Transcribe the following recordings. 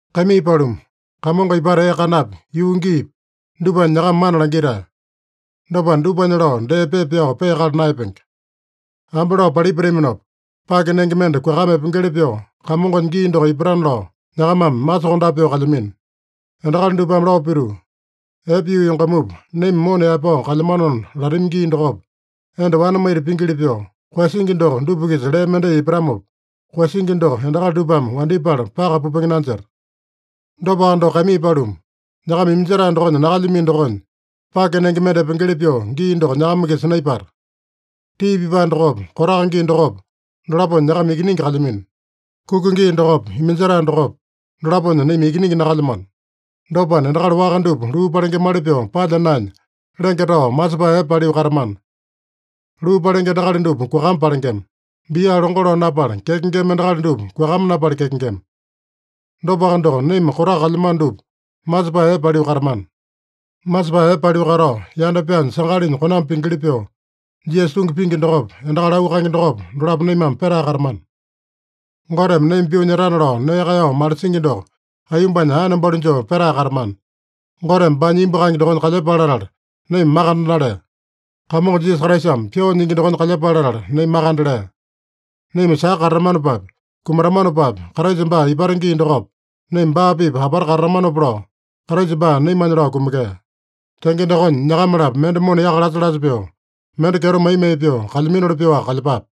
Kaimii paluma, Kamongo ipata ee kanapi, yuu giipi, dupanya nyakama mana langitae. Dopana, dupanya lao dee pepa pyao peakala naeyapenge. Ambe lao palipataminopa, pake nenge mende kuakama epengeli pyoo, Kamongonya gii doko ipatana lao, nyakamame masokondape pyoo kalyamino. Endakali dupame lao pituu, “Epe yuu yongamupa, naima mona yaepao kalyamanona” latami gii dokopa, enda wane maita pingili pyoo, koeyasingi doko dupa-kisa lee mendai ipatamopa, koeyasingi doko endakali dupame wandyepala paka pupenge nanjeta. Dopaka doko, kaimii paluma, nyakama iminjetae dokonya nakalyamino dokonya, pake nenge mende epengeli pyoo gii doko nyakama-kisa naipata. Tii pipae dokopa, kotaka gii dokopa, dolaponya nyakama ikiningi kalyamino. Kuka gii dokopa, iminjetae dokopa, dolaponya naima ikiningi nakalyamano. Dopana, endakali waka dupa luu palengemali pyoo palya naenya, lenge tao masepae epe paliu katamana. Luu palenge endakali dupa kuakama palengema. Bia longo lao napala kyakengema endakali dupa kuakama napala kyakengema. Dopaka doko, naima kotaka kalyamano dupa masepae epe paliu katamana. Masepae epe paliu katao, yanda pyaanya sangalinya konambi pingili pyoo, Jisasa tungi pingi dokopa, endakali auu kaenge dokopa, dolapo naimame petae katamana. Goteme naima pyoo nyetana lao nee kaeyao malisingi doko aiyombanya aene balu joo petae katamana. Goteme baanya imbu kaenge dokonya kalyepale latala naima makande nalea. Kamongo Jisasa Kraisame pyoo nyingi dokonya kalyepale latala naima makande lea. Naima saka katatamanopapi, kumatamanopapi, Kraisa baa ipata gii dokopa, naima baa-pipa apata katatamanopa lao, Kraisa baa naimanya lao kumekea. Tenge dokonya, nyakama-lapo mende mona yaka lasa-lasa pyoo, mende kyeto mai-mai pyoo kalyaminoli pyoaka kalyepape.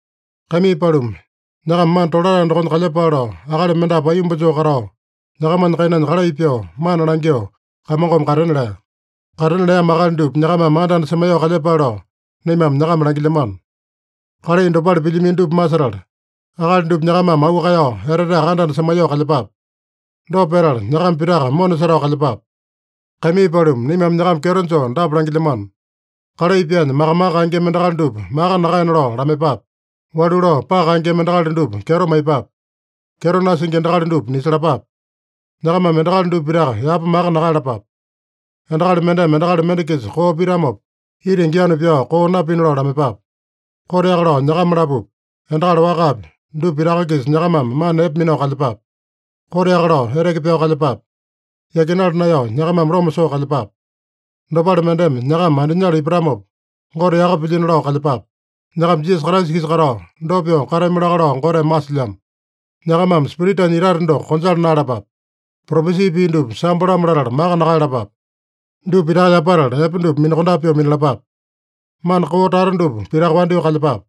Kaimii paluma, nyakama mana tolatae dokonya kalyepale lao, akali mendapu aiyomba joo katao, nyakamanya kainanya kalai pyoo, mana langyoo, Kamongome katena lea. Katena leamo akali dupa nyakamame anda-anda semaiyoo kalyepale lao, naimame nyakama langilyamano. Kalai dopale pilyamino dupa masetala, akali dupa nyakamame auu kaeyao eteteaka anda-anda semaiyoo kalyepape. Dopa petala, nyakama pitaka mona setao kalyepape. Kaimii paluma, naimame nyakama kyeto joo dapa langilyamano: Kalai pyaanya maka-maka kaengema endakali dupa maka nakaena lao lamaiyepape. Walu lao paka kaengema endakali dupa kyeto maiyepape. Kyeto nasingi endakali dupa nisalapape. Nyakamame endakali dupa pitaka yapa maka nakaeyalapape. Endakali mendeme endakali mende-kisa koo pitamopa, itingi yanu pyao koo napina lao lamaiyepape. Koteaka lao nyakama-lapopi, endakali wakapi, dupa pitaka-kisa nyakamame mana epe minao kalyepape. Koteaka lao eteke pyao kalyepape. Yakinala naeyao nyakamame loma soo kalyepape. Dopale mendeme nyakama andinyala ipatamopa, Gote yaka pilyino lao kalyepape. Nyakama Jisasa Kraisa-kisa katao, dopa pyoo katami laka lao Goteme masilyamo. Nyakamame Spiritanya itate doko konjala naeyalapape. Propesi pii dupa sambo-lamo latala maka nakaeyalapape. Dupa pitaka yapatala, epe dupa minakondape pyoo minalapape. Mana koo tata dupa pitaka wandyoo kalyepape.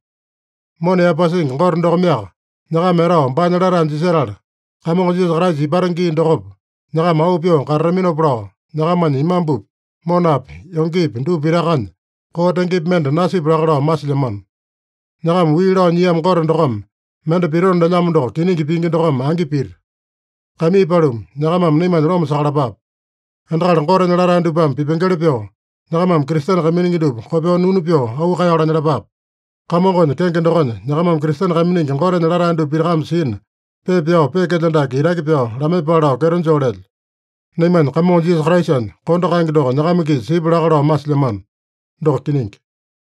Mona yaepasingi Gote dokomeaka nyakama etao baanya latae jisetala, Kamongo Jisasa Kraisa ipata gii dokopa, nyakama auu pyoo katataminopa lao, nyakamanya imambupi, monapi, yongepi dupa pitakanya koo tengepi mende nasipya laka lao masilyamano. Nyakama wii lao nyiamo Gote dokome mende pitona lelyamo doko kiningi pingi dokome angi pita. Kaimii paluma, nyakamame naimanya loma sakalapape. Endakali Gotenya latae dupame pipengeli pyoo, nyakamame Kristene kaiminingi dupa kopyoo nunu pyoo auu kaeyao lanyalapape. Kamongonya kenge dokonya nyakamame Kristene kaiminingi Gotenya latae dupa pitakame sina, pepa pyao peekelyo dake itaki pyao lamaiyepale lao kyeto joo lelyo. Naimanya Kamongo Jisasa Kraisanya kondo kaenge doko nyakama-kisa sipya laka lao masilyamano. Doko kiningi.